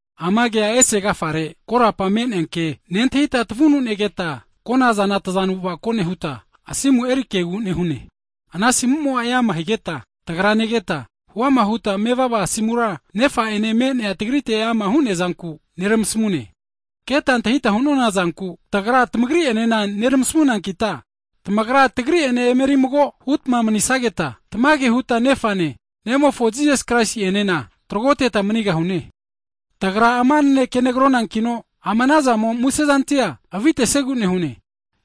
Ama Kea ese agafare korapa me'nea ke, nentahita tavunu negeta, konazana tazanu avako nehuta, asimu eri Kegu nehune. Ana asimu'mo eama higeta tagra negeta, huama huta mevava asimura, Nefa ene me'nea tagrite eama hu'neazanku neramasmune. Keta antahita hu'nonazanku, tagra tamagri enena neramasmunankita, tamagra tagri'ene emeri mago hutma manisageta, tamage huta Nefane, Nemofo Jisas Kraisi'enena tragoteta manigahune. Tagra ama naneke negronankino, ama anazamo musezantia avitesiegu nehune.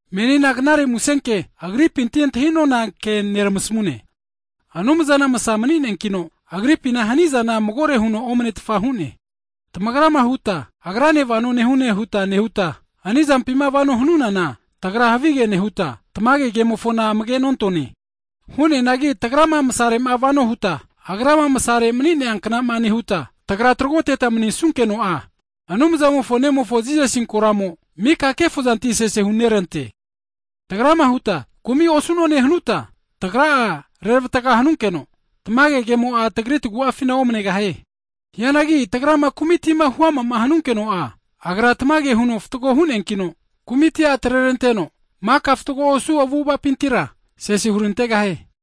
Menina Knare Musenke Agripinti antahi'nona ke neramasmune, Anumzana masa mani'neankino, Agripina hanizana magore huno omanetfa hu'ne. Tagrama huta Agrane vano nehune huta nehuta, hanizampima vano hanunana tagra havige nehuta, tamage kemofona amage nontone. Hu'neanagi tagrama masare'ma vano huta, Agrama masare mani'nea kna'ma nehuta, tagrama trogoteta manisunkeno'a, Anumzamofo Nemofo Jisasi koramo mika kefozantia sese hunerante. Tagrama huta kumi osu'none hanuta, tagra'a reravatga hanunkeno, tamage ke'mo'a tagri tagu'afina omanegahie. Hianagi tagrama kumitima huama hanunkeno'a, Agra tamage huno fatgo hu'neankino, kumitia atreranteno maka fatgo osu avu'avapintira sese hurantegahie.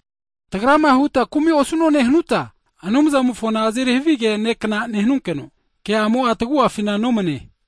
Tagrama huta kumi osu'none hanuta, Anumzamofona azeri havige ne' kna nehunkeno, ke'amo'a tagu'afina nomane.